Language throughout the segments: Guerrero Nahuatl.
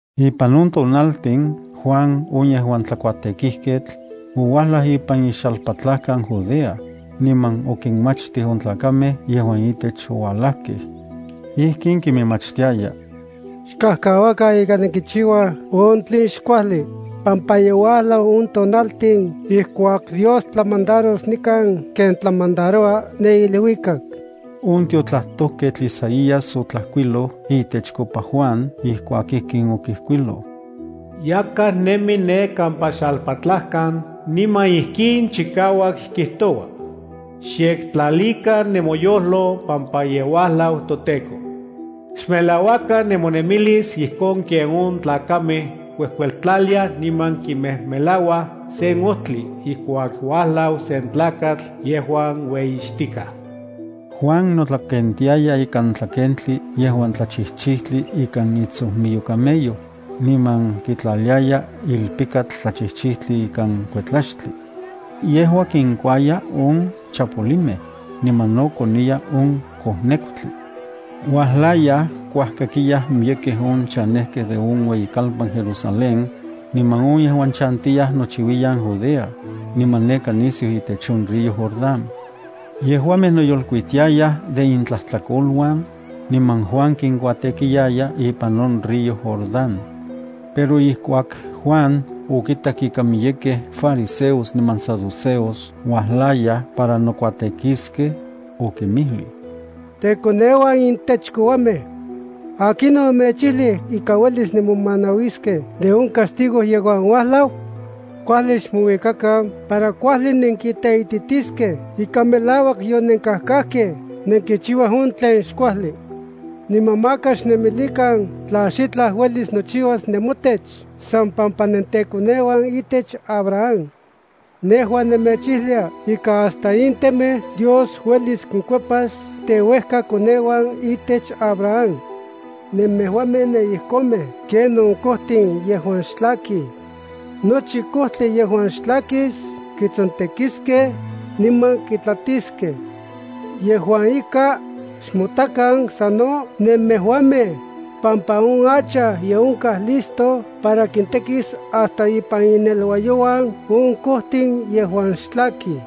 Ipan on tonaltin, Juan on yejuan tlakuatekijketl, ouajlaj ipan ixalpatlajkan Judea, niman okinmachtij on tlakamej yejuan itech oualajkej. Ijkin kiminmachtiaya: —Xkajkauakan ika nenkichiuaj on tlen xkuajli, pampa ye uajlau on tonaltin ijkuak Dios tlamandaros nikan ken tlamandaroua ne iluikak. On tiotlajtojketl Isaías otlajkuiloj itechkopa Juan ijkuak ijkin okijkuiloj: Yakaj nemi ne kampa xalpatlajkan niman ijkin chikauak kijtoua: “Xyektlalikan nemoyojlo pampa ye uajlau toTEKO. Xmelauakan nemonemilis ijkon ken on tlakamej kuejkueltlaliaj, niman kimejmelauaj se ojtli ijkuak uajlau sen tlakatl yejuan ueyixtikaj.” Juan notlakentiaya ikan tlakentli yejuan tlachijchijtli ikan itsojmiyo camello, niman kitlaliaya ilpikatl tlachijchijtli ikan kuetlaxtli. Yejua kinkuaya on chapolimej, niman no koniya on kojnekutli. Uajlayaj kuajkakiyaj miyekej on chanejkej de on ueyikalpan Jerusalén, niman on yejuan chantiyaj nochiuiyan Judea, niman neka nisiu itech on río Jordán. Yejuamej noyolkuitiayaj de intlajtlakoluan, niman Juan kinkuatekiaya ipan on río Jordán. Pero ijkuak Juan okitak ika miyekej fariseos niman saduceos uajlayaj para nokuatekiskej, okinmijlij: —¡Tekoneuan intech kouamej! ¿Akinon omechijlij ika uelis nenmomanauiskej de on castigo yejuan uajlau? Kuajli xmouikakan para kuajli nenkiteititiskej ika melauak yonenkajkajkej nenkichiuaj on tlen xkuajli. Niman maka xnemilikan tla xitlaj uelis nochiuas nemotech san pampa nenteuejkakoneuan itech Abraham. Nejua nemechijlia ika hasta in temej Dios uelis kinkuepas teuejkakoneuan itech Abraham. Nemejuamej nenijkonmej ken on kojtin yejuan xtlakij. Nochi kojtli yejuan xtlakis kitsontekiskej niman kitlatiskej. Yejua ika, xmotakan sano nemejuamej, pampa on hacha ye onkaj listo para kintekis hasta ipan inneluayouan on kojtin yejuan xtlakij.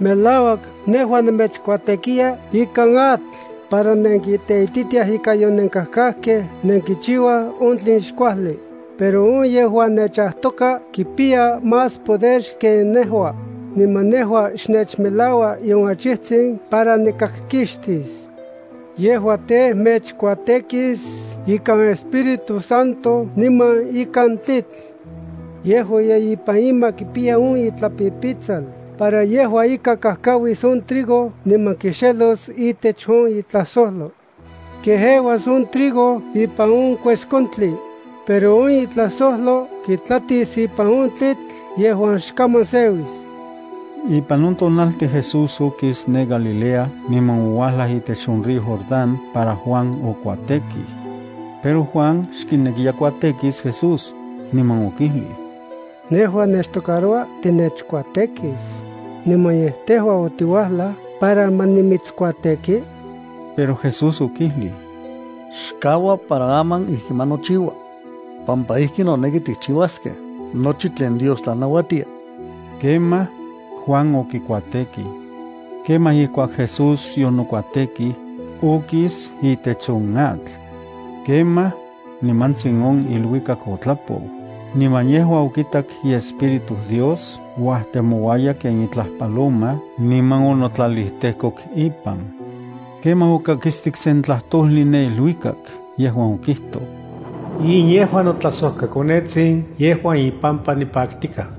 Melauak nejua nemechkuatekiya ikan atl para nenkiteititiaj ika yonenkajkajkej nenkichiuaj on tlen xkuajli, pero on yejuan nechajtoka kipiya más poder xken nejua, niman nejua xnechmelaua nion achijtsin para nikakkixtis. Yejua tej, mechkuatekis ikan Espíritu Santo niman ikan tlitl. Yejua ye ipan ima kipiya on itlapipitsal para yejua ika kajkauis on trigo niman kixelos itech on itlajsojlo. Kejeuas on trigo ipan on kueskontli, pero on itlajsojlo kitlatis ipan on tlitl yejuan xkaman seuis. Ipan on tonaltin Jesús okis ne Galilea niman ouajlaj itech on río Jordán para Juan okuatekij. Pero Juan xkinekiya kuatekis Jesús, niman okijlij: —Nejua nechtocaroua tinechkuatekis, ¿niman yej tejua otiuajlaj para ma nimitskuateki? Pero Jesús okijlij: —Xkaua para aman ijki ma nochiua, pampa ijki noneki tikchiuaskej nochi tlen Dios tlanauatia. Kemaj, Juan okikuatekij. Kemaj ijkuak Jesús yonokuatekij, okis itech on atl. Kemaj on, nimantsin on iluikak otlapou, niman yejua okitak iEspíritu Dios uajtemouaya ken itlaj paloma niman onotlalijtejkok ipan. Kemaj okakistik sen tlajtojli ne iluikak yejuan okijtoj: —In yejua notlajsojkaKonetsin yejuan ipampa nipaktikaj.